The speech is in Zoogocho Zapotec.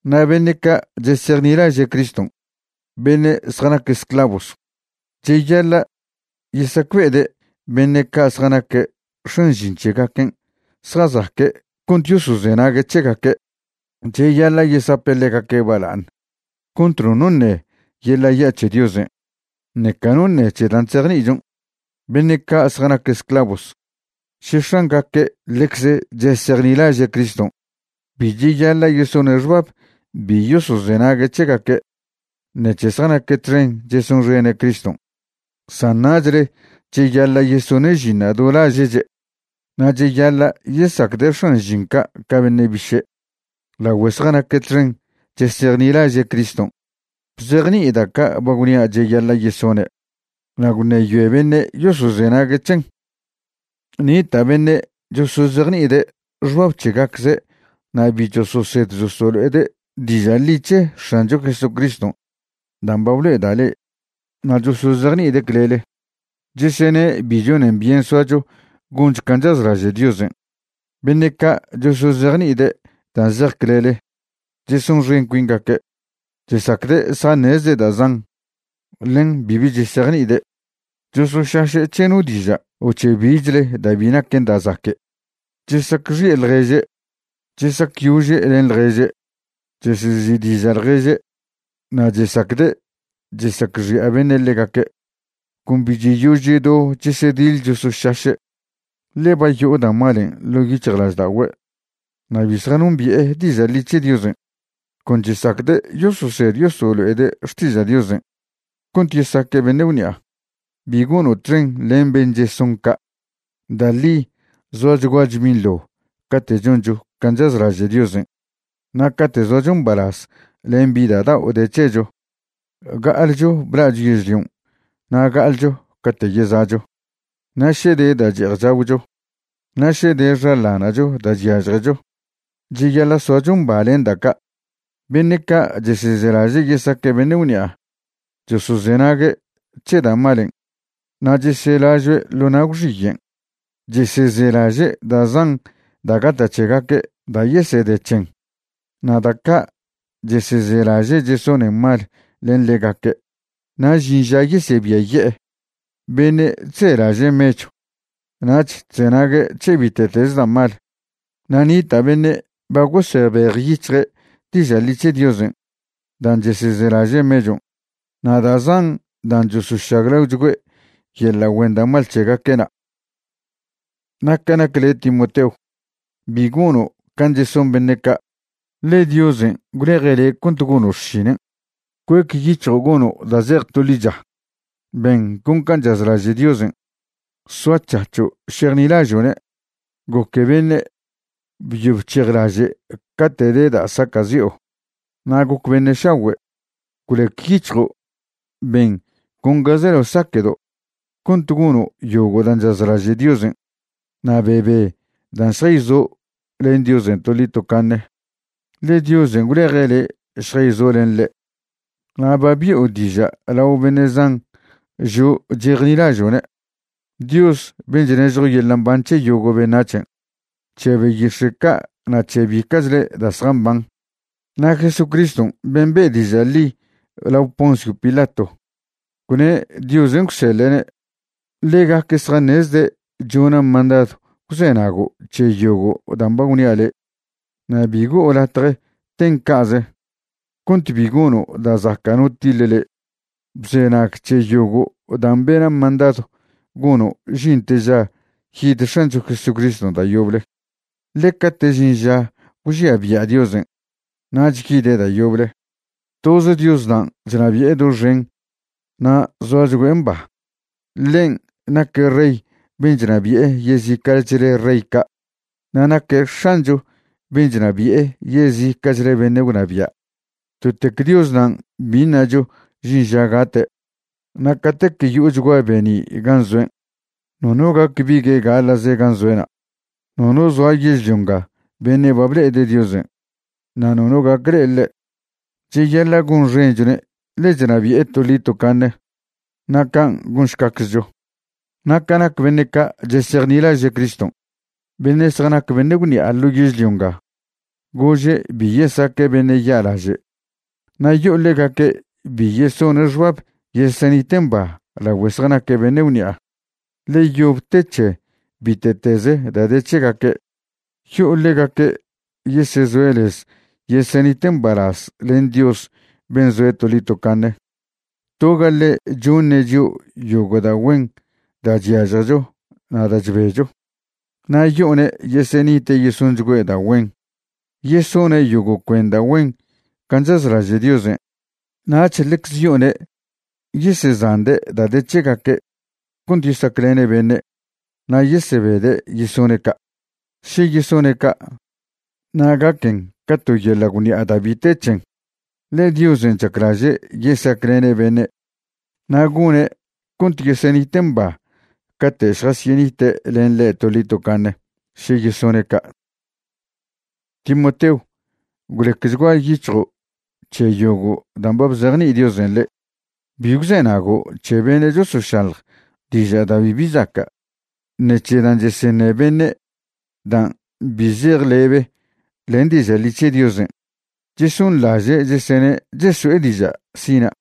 Na' beṉe' ca' chesejnilaže' Criston', beṉe' zjanac esclavos, cheyaḻa' yesacbe'ede' beṉe' ca' zjanaque' x̱an žin c̱hegaquen' zjazaque' cont yosozenague' c̱hegaque'. Cheyaḻa' yesape' ḻegaque' bala'aṉ cont nono ṉe yeḻa' ya' c̱he Diosen', ṉeca no ṉe c̱he dan' chzejni'ichon'. Beṉe' ca' zjanac esclavos, še x̱angaque' ḻecze chesejnilaže' Criston', bi cheyaḻa' yesone' xbab bi yosozenague' c̱hegaque' ṉec̱he zjanaque' txen chesonxene' Criston', san nachle cheyaḻa' yesone' žinṉa' do laže'che' na' cheyaḻa' yesacde' x̱an žin ca' ca beṉe' biše', lagüe zjanaque' txen chesejnilaže' Criston'. Bzejni'i da' ca' ba gwnia' cheyaḻa' yesone' na' gwṉeyoe beṉe' yosozenague' c̱hen. Nita' beṉe' chosozejni'ide' xbab c̱hegacze' na' bi chososed chosolo'ede' diža' ḻi c̱he X̱ancho Jesucriston' dan' ba blo'eda' le', na' chosozejni'ide' clele, chesene' bi chonen byen soacho goncho can' chazlaže' Diosen'. Beṉe' ca' chosozejni'ide' dan' zej clele chesonxen cuingaque', chesacde' zjaṉezde' da' zan, ḻen bibi chesejni'ide'. Chosošaše' c̱he no diža' o c̱he bichle da' bi naquen da' zaque', chesacxi'e ḻježe', chesacyože' len ḻježe', chesezi'diža' ḻježe', na' chesacde' chesacxi'a beṉe' ḻegaque'. Con bi cheyož chedo chesediḻ chosošaše', ḻe ba yo'o da' malen' ḻo' yic̱hjlažda'ogüe' na' bi zjanombi'e diža' ḻi c̱he Diosen'. Con chesacde' yososed yosolo'ede' xtiža' Diosen' cont yesaque' beṉe' gwṉi'a. Bi gono' txen len ben' cheson ca'. Da' ḻi zoachguacho binḻo cate' choncho can' chazlaže' Diosen' na' cate' zoacho mbalaz len bi da' dao' de c̱hecho. Ga'alcho bla'cho yežlion' na' ga'alcho cate' yeza'cho. Na' še de da' che'ej chagwcho na' še de xaḻana'cho da' chyažjecho, cheyaḻa' soacho mba len da' ca'. Beṉe' ca' chesezelaže' yesaque' beṉe' gwṉi'a chosozenague' c̱he da' malen' na' cheselažoe' ḻo na' gwxiyen'. Chesezelaže' da' zan da' gata' c̱hegaque' da' yesede c̱hen, na' da' ca' chesezelaže' chesonen mal len ḻegaque' na' žin ža yesebiaye'e. Beṉe' chzelaže' mechw nach chzenague' c̱he bite'teze da' mal. Na' nita' beṉe' ba gosebejyic̱hje' diža' ḻi c̱he Diosen' dan' chesezelaže' mechon', na' da' zan dan' chosožaglaochgüe' yeḻa' güen da' mal c̱hegaque'na'. Na' ca nac le' Timoteo, bi gono' can' cheson beṉe' ca', ḻe Diosen' gwleje' le' cont gono' xšinen'. Cuec yic̱hjo' gono' da' zej to ḻicha, ben con can' chazlaže' Diosen', soac̱hac̱ho' šejnilažo'ne', goque beṉe', byo bchejlaže' cate' de da' saca'zi'o, na' goc beṉe' šagüe'. Gwlec yic̱hjo' ben con ga zelao saquedo' cont gono' yogo' dan' chazlaže' Diosen'. Na' bebe dan' šjayzo' len Diosen' toḻi tocaṉe, ḻe Diosen' gwleje' le' šjayzo' len ḻe', na' ba bi'o diža' lao beṉe' zan žo' chejnilažo'ne'. Dios ben' chnežjo yeḻa' mban c̱he yogo' beṉac̱hen', c̱he beyix̱e' ca' na' c̱he bica'chle da' zjamban, na' Jesucristw ben' be' diža' ḻi lao Poncio Pilato, gwne' Diosen' gwseḻe'ne', ḻegaque' zjaṉezde' chona' mandadw gwzenago' c̱he yogo' dan' ba gwnia' le', na' bi go'o latje ten ca'ze, cont bi gono' da' zaca' no tiḻe le'. Bzenag c̱he yogo' dan' bena' mandadw gono' žinte ža yid X̱ancho Jesucriston' da' yoble. Ḻe cate' žin ža gwžia bia' Diosen', nach yide' da' yoble. Toz Dios nan' chnabi'e doxen na' zoachgüe' mba. Ḻen' naque' Rey ben' chnabi'e yezica'chle rey ca', na' naque' X̱ancho ben' chnabi'e yezica'chle beṉe' gwnabia'. Totec Dios nan' bi ṉacho žin ža gate'. Na' catec yo'ochgua be'ni' gan' zoen', nono gac bigue' gaḻa'ze gan' zoe'na'. Nono zoa yežlio nga beṉe' ba ble'ede' Diosen' na' nono gac le'e ḻe'. Cheyaḻa' gonxenchone' ḻe chnabi'e toḻi tocaṉe. Na' can' gonšcaczcho. Na' ca nac beṉe' ca' chesejnilaže' Criston', beṉe' zjanac beṉe' gwṉi'a ḻo yežlio nga, gože' bi yesaque' beṉe' ya'laže'. Na' yo'o ḻegaque' bi yesone' xbab yesenite' mba lagüe zjanaque' beṉe' gwṉi'a, ḻe yob te c̱he bite'tez da' de c̱hegaque'. Yo'o ḻegaque' yesezoe' lez yesenite' mbalaz len Dios ben' zoe' toḻi tocaṉe. Toga ḻe' choṉe' chio' yogo' da' güen da' chyažjecho na' da' chbecho. Na' yo'one' yesenite' yesonchgüe' da' güen, yesone' yogo' cuen da' güen can' chazlaže' Diosen', nach ḻecze yo'one' yesezande' da' de c̱hegaque' cont yesaclene' beṉe' na' yesebede' yesone' ca'. Še yesone' ca', na' gaquen ca to yeḻa' gwṉi'a da' bi te c̱hen, ḻe Diosen' chaclaže' yesaclene' beṉe', na' gone' cont yesenite' mba cate' šjasyenite' len ḻe' toḻi tocaṉe še yesone' ca'. Timoteo, gwlecchgua yic̱hjo' c̱he yogo' dan' ba bzejni'i Diosen' le'. Bi gwzenago' c̱he beṉe' chosošaḻj diža' da' bibi zaca', ṉe c̱he dan' cheseṉe beṉe' dan' bi zej lebe len diža' ḻi c̱he Diosen'. Chesonḻaže' chesene' cheso'e diža' sina'.